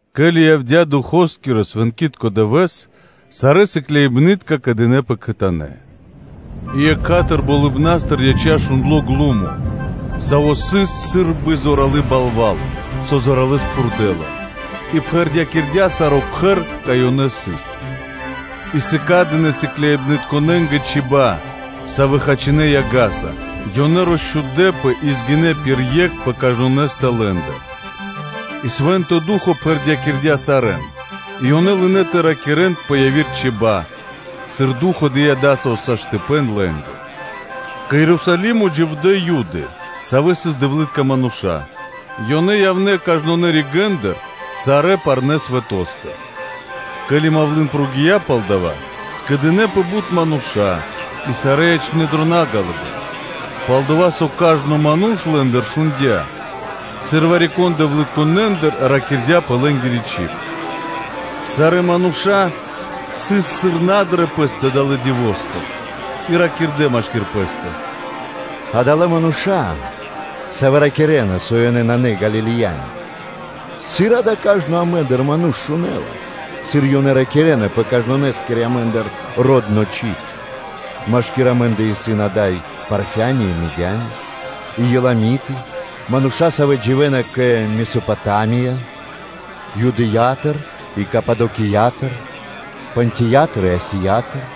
Ке́ли явдя́ Духо́скирэ-свэнкитко дывэ́с (Ду́хо), сарэ́ сыкляибны́тка скэдынэ́пэ кхэтанэ́. И екха́тыр (сра́зу) болыбна́стыр яця́ шундло ґлумо, саво́ сыс сы́рбы зоралы́ балва́л, со зоралэ́с пхурдэла, и пхэрдякирдя́ саро́ кхэр, кай ёнэ сыс. И сыкадынэ сыкляибнытконэ́нгэ чиба́ (чибья́), савэ́ хачинэ яга́са, ёнэ росчхудэпэ и згинэ пир екх пэ кажнонэ́стэ лэ́ндыр. И Свэ́нто Ду́хо (Фа́но) пхэрдякирдя́ сарэ́н и ёнэ лынэ́ тэ ракирэ́н пэ яви́р чиба́ (чибья́), сыр Ду́хо (Фа́но) дыя́ во́ля лэ́нгэ. Кэ Ерусалимо дживдэ́ Юды, савэ́ сыс дэвлы́тка мануша́; ёнэ явнэ́ кажнонэ́ ригэ́ндыр сарэ́ парнэ́ свэто́стыр. Ке́ли мавлы́н (малва) прогия́ (накхця́) пал дава́, скэдынэ́пэ бут мануша́, и сарэ́ ячнэ́ дро на ґалыибэ́н, пал-дова́ со кажно ману́ш лэ́ндыр шундя́, сыр вари-кон дэвлытконэндыр ракирдя́ пэ лэ́нгири чиб. Сарэ́ мануша́ сыс кокорэ́, сыр на дрэ пэ́стэ далэ́ дивостыр, и ракирдэ́ машки́р пэ́стэ: “Адалэ́ мануша́, савэ́ ракирэ́на, со ёнэ исын на Галилеяни? Сыр да кажно амэ́ндыр ману́ш шунэ́ла, сыр ёнэ ракирэ́на пэ каждонэскири амэ́ндыр родно чиб. Машкир амэ́ндэ исын ада́й Парфяни, и Мидяни, и Еламиты, мануша́, савэ́ дживэ́на кэ Месопотамия; Юдэя́тыр и Кападокиятыр, Понтиятыр и Асиятыр,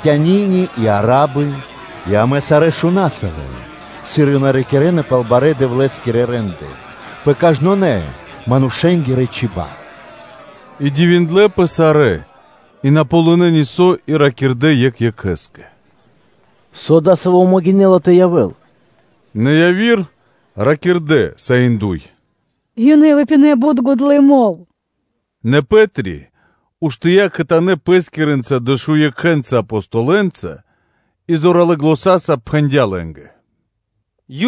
Критяни и Арабы и амэ сарэ́ шунаса лэн, сыр ёнэ ракирэ́на пал барэ́ Дэвлэ́скирэ рэ́нды пэ кажнонэ́ – манушэ́нгирэ чиба́ (чибья́)?” И дивиндлэ́пэ сарэ́, и на ґалынэ́ нисо́ и ракирдэ́ екх екхэ́скэ: “Со дасаво сашты́ (могинэ́ла) тэ явэ́л?” Нэ яви́р ракирдэ́ саиндой: “Ёнэ выпинэ бут гудлы мол (вино).” Нэ Пэ́три уштыя́ кхэтанэ́ пэ́скирэ дэшудуенца Апостолэнца ґаздыя́ пэ́скири зан, и зоралэ́ заня́са пхэндя́ лэ́нгэ: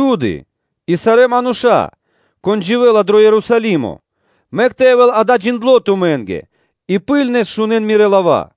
“Юды и сарэ́ мануша́, кон дживэ́ла дро Ерусалимо! Мэк тэ явэ́л дава́ джиндло́ тумэ́нгэ, и ракхибны́ткэс шунэ́н мирэ́ лава́.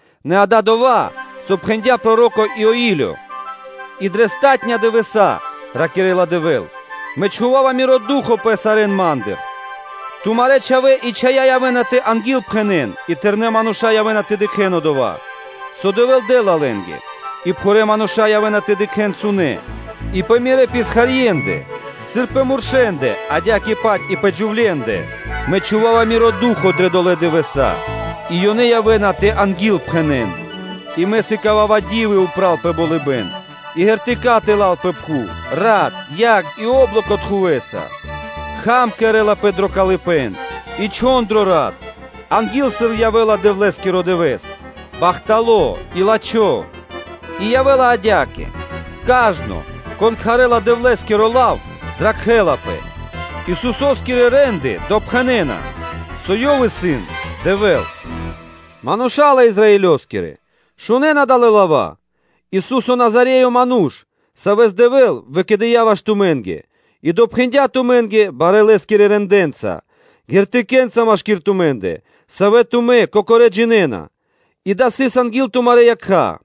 Нэ дава́ исын дова́, со пхэндя́ проро́ко Иоилё: “И дрэ палатунэ́ (последня) дывэса́, – ракирэ́ла Дэвэ́л, – Мэ чхува́ва Миро Ду́хо (Фа́но) пэ кажно лоч (плоть), тумарэ́ чхавэ́ и чхая́ явэ́на тэ ангилпхэнэн и тэрнэ́ мануша́ явэ́на тэ дыкхэ́н дова́, со Дэвэ́л дэ́ла лэ́нгэ, а пхурэ́ мануша́ явэ́на тэ дыкхэ́н сунэ́; и пэ Мирэ́ писхарьендэ, сыр пэ муршэндэ адя́кэ-паць и пэ джувлендэ, Мэ чхува́ва Миро Ду́хо (Фа́но) дрэ долэ́ дывэса́, и ёнэ явэ́на тэ ангилпхэнэн. И Мэ сыкава́ва ди́вы упра́л пэ болыбэ́н и знаме́нии (ґертыка́) тэла́л пэ пхув, рат, яг и о́блоко тхувэса. Кхам кэрэ́лапэ дро калыпэ́н, и чхон дро рат, анги́л сыр явэ́ла Дэвлэ́скиро дывэ́с, бахтало́ и лачхо́. И явэ́ла адя́кэ: кажно, кон кхарэ́ла Дэвлэ́скиро лав, зракхэ́лапэ. Исусо́скирэ рэ́нды допхэнэна, со Ёв исын Дэвэ́л. Мануша́лэ Израилёскирэ! Шунэ́н адалэ́ лава́: Исусо́скирэ Назареёскирэ, Манушэ́с, Савэс Дэвэ́л выкэдыя́ ваш тумэ́нгэ, и допхэндя тумэ́нгэ барэ́ Лэ́скирэ рэндэ́нца (делэнца), ґертыкэ́нца машки́р тумэ́ндэ, савэ́ тумэ́ кокорэ́ джинэ́на, и дава́ сыс анги́л тумарэ́ якха́.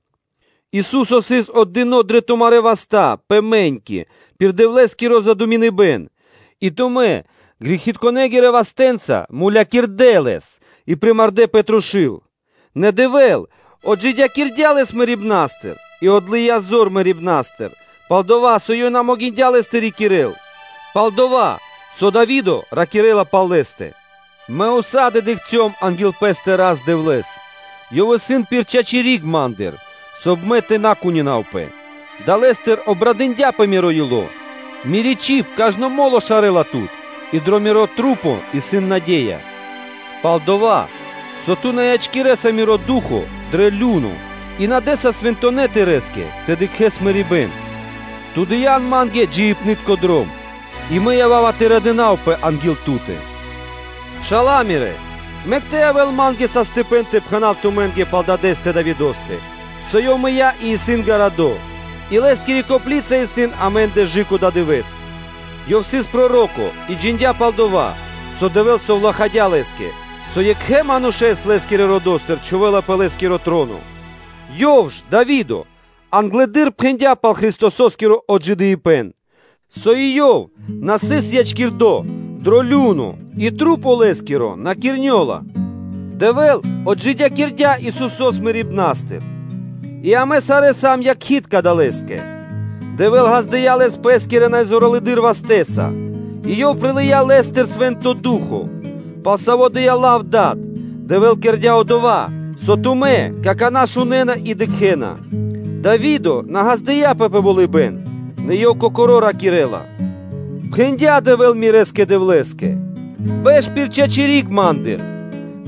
Ису́со сыс отдыно́ дрэ тумарэ́ васта́ пэ мэ́ньки пир Дэвлэ́скиро задуминыбэн, и тумэ́ грэхитконэ́ вастэ́нца мулякирдэ́ Лэс и примардэ пэ трушу́л; нэ Дэвэ́л отджидякирдя́ Лэс мэрибна́стыр, и отлыя зор мэрибна́стыр, пал-дова́ со ёв на могиндя́ Лэс тэ рикирэ́л. Пал-дова́ со Дави́до ракирэ́ла пал Лэ́стэ: “Мэ ўса́ды (сак) дыкхцём анги́л пэ́стэ Рас-Дэвлэ́с, Ёв исын пир чачи́ (право) риг ма́ндыр, соб (кай) мэ тэ на кунинавпэ; далэ́стыр обрадындяпэ миро ило́, мири́ чиб кажно мо́ло шарэла Тут и дрэ мирэ́ маса́ исын наде́я. Пал-дова́ со Ту на ячкирэса миро ду́хо (фа́но) дрэ лю́но (адо), и Ту на дэ́са свэнтонэ́ Тырэ́скэ тэ дыкхэ́л мэрибэ́н; Ту дыя́н ма́нгэ джиибнытко дром; и мэ ява́ва тэ радынавпэ анги́л Ту́тэ.” Мануша́лэ-Пшала́лэ! Мэк тэ явэ́л ма́нгэ саштыпэн (возможность) тэ пхэна́в тумэ́нгэ пал дадэ́стэ Давидо́стэ, со ёв мыя́ и сыс гарадо́, и лэ́скири копли́ца исын амэ́ндэ кэ/жы́ко дава́ дывэ́с. Ёв сыс проро́ко и джиндя́ пал дова́, со Дэвэ́л совлахадя́ лэ́скэ, со екхэ манушэ́с лэ́скирэ родо́стыр чхувэ́ла пэ лэ́скиро троно, ёв ж, Дави́до, англэды́р пхэндя́ пал Христосо́скиро отджидыибэн, со и Ёв на сыс ячкирдо дро лю́но и тру́по Лэ́скиро на кирнёла. Дэвэ́л отджидякирдя́ Исусо́с мэрибна́стыр, и амэ сарэ́ сам якхи́тка далэскэ. Дэвэ́л ґаздыя́ Лэс Пэ́скирэ най зоралэды́р вастэ́са, и Ёв прилыя́ Лэ́стыр Свэ́нто Ду́хо (Фа́но), пал саво́ дыя́ лав Дад; Дэвэ́л кэрдя́ дова́, со тумэ́ какана́ шунэ́на и дыкхэ́на. Дави́до на ґаздыя́пэ пэ болыбэ́н; нэ ёв кокоро́ ракирэ́ла: ‘Пхэндя Дэвэ́л мирэ́скэ Дэвлэ́скэ, бэш пир чачи́ риг Ма́ндыр.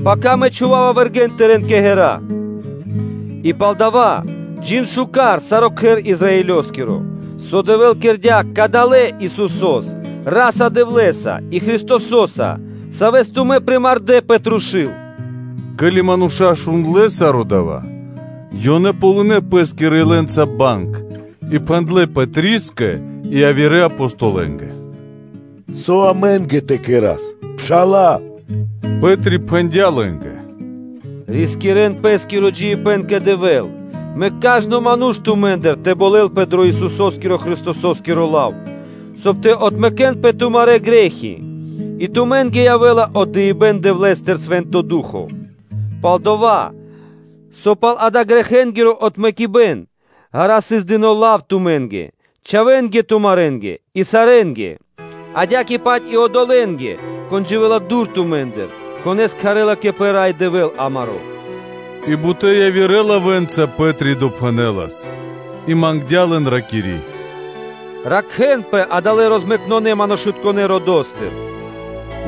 Пака Мэ чхува́ва вэргэ́н Тырэ́н кэ ґэра́’. И палдава́ джин миштэ́с, саро́ кхэр Израилёскиро, со Дэвэ́л кэрдя́ Кадалэ́ Исусо́са, Ра́са-Дэвлэ́са и Христосо́са, Савэс тумэ́ примардэ пэ трушу́л.” Ке́ли мануша́ шундлэ́ саро́ дава́, ёнэ ґалынэ́ пэ́скирэ илэнца банг и пхэндлэ́ Пэтрискэ и явирэ Апостолэнгэ: “Со амэ́нгэ тэ кэра́с, Мануша́лэ-Пшала́лэ?” Пэ́три пхэндя́ лэ́нгэ: “Рискирэ́н пэ́скиро джиибэ́н кэ Дэвэ́л, мэк кажно ману́ш тумэ́ндыр тэ болэлпэ дро Исусо́скиро Христосо́скиро лав, соб (кай) тэ отмэкэнпэ тумарэ́ грэ́хи, и тумэ́нгэ явэ́ла отдыибэ́н Дэвлэ́стыр-Свэ́нто Ду́хо (Фа́но). Пал-дова́ со пал дава́ грэхэнгиро отмэкибэн ґара́ сыс дыно́ лав тумэ́нгэ, чхавэ́нгэ тумарэнгэ и сарэ́нгэ, адя́кэ-паць и одолэ́нгэ, кон дживэ́ла дур тумэ́ндыр, конэ́с кхарэ́ла кэ Пэ Рай Дэвэ́л амаро́.” И бутэ́ явирэ лавэ́нца Пэ́три допхэнэлас и мангдя́ лэн, ракири́: “Ракхэ́нпэ адалэ́ розмэкнэ манушытконэ́ родо́стыр.”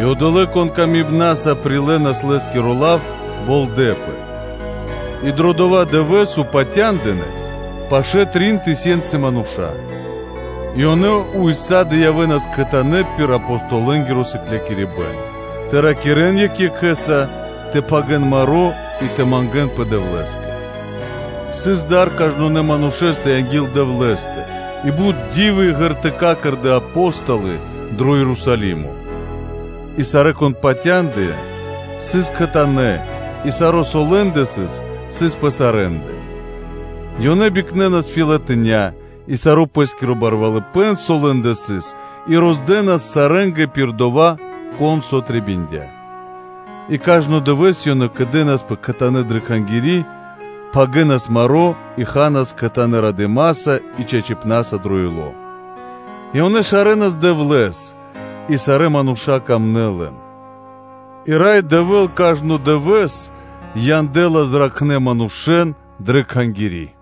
И одолэ́, кон илэ́са прилэлас лэ́скиро лав, болдэпэ, и дро дова́ дывэ́с упатя́ндынэ пашэ́ трин тысёнцы мануша́. И ёнэ ўса́ды (сак) явэ́нас кхэтанэ́ пир Апостолэнгиро сыклякирибэ́н тэ ракирэ́н екх екхэ́са, тэ пхагирэн маро́ и тэ мангэ́нпэ Дэвлэ́скэ. Сыс дар кажнонэ́ манушэ́стэ анги́л Дэвлэ́стэ; и бут ди́вы и ґертыка́ кэрдэ́ Апо́столы дро Ерусалимо. И сарэ́, кон патяндыя, сыс кхэтанэ́, и саро́, со лэ́ндэ сыс, сыс пэ сарэ́ндэ; ёнэ бикнэнас фэлатиня́ и саро́ пэ́скиро барвалыпэ́н, со лэ́ндэ сыс, и роздэнас сарэ́нгэ пир дова́, кон со трэбиндя. И кажно дывэ́с ёнэ кэдэнаспэ кхэтанэ́ дрэ Кхангири́, пхагирэнас маро́ и ханас кхэтанэ́ радыма́са и чачипна́са дро ило́, и ёнэ шарэнас Дэвлэ́с и сарэ́ мануша́ сыкадэ паты́в лэ́нгэ; и Рай Дэвэ́л кажно дывэ́с янэлас зракхнэ́ манушэ́н дрэ Кхангири́.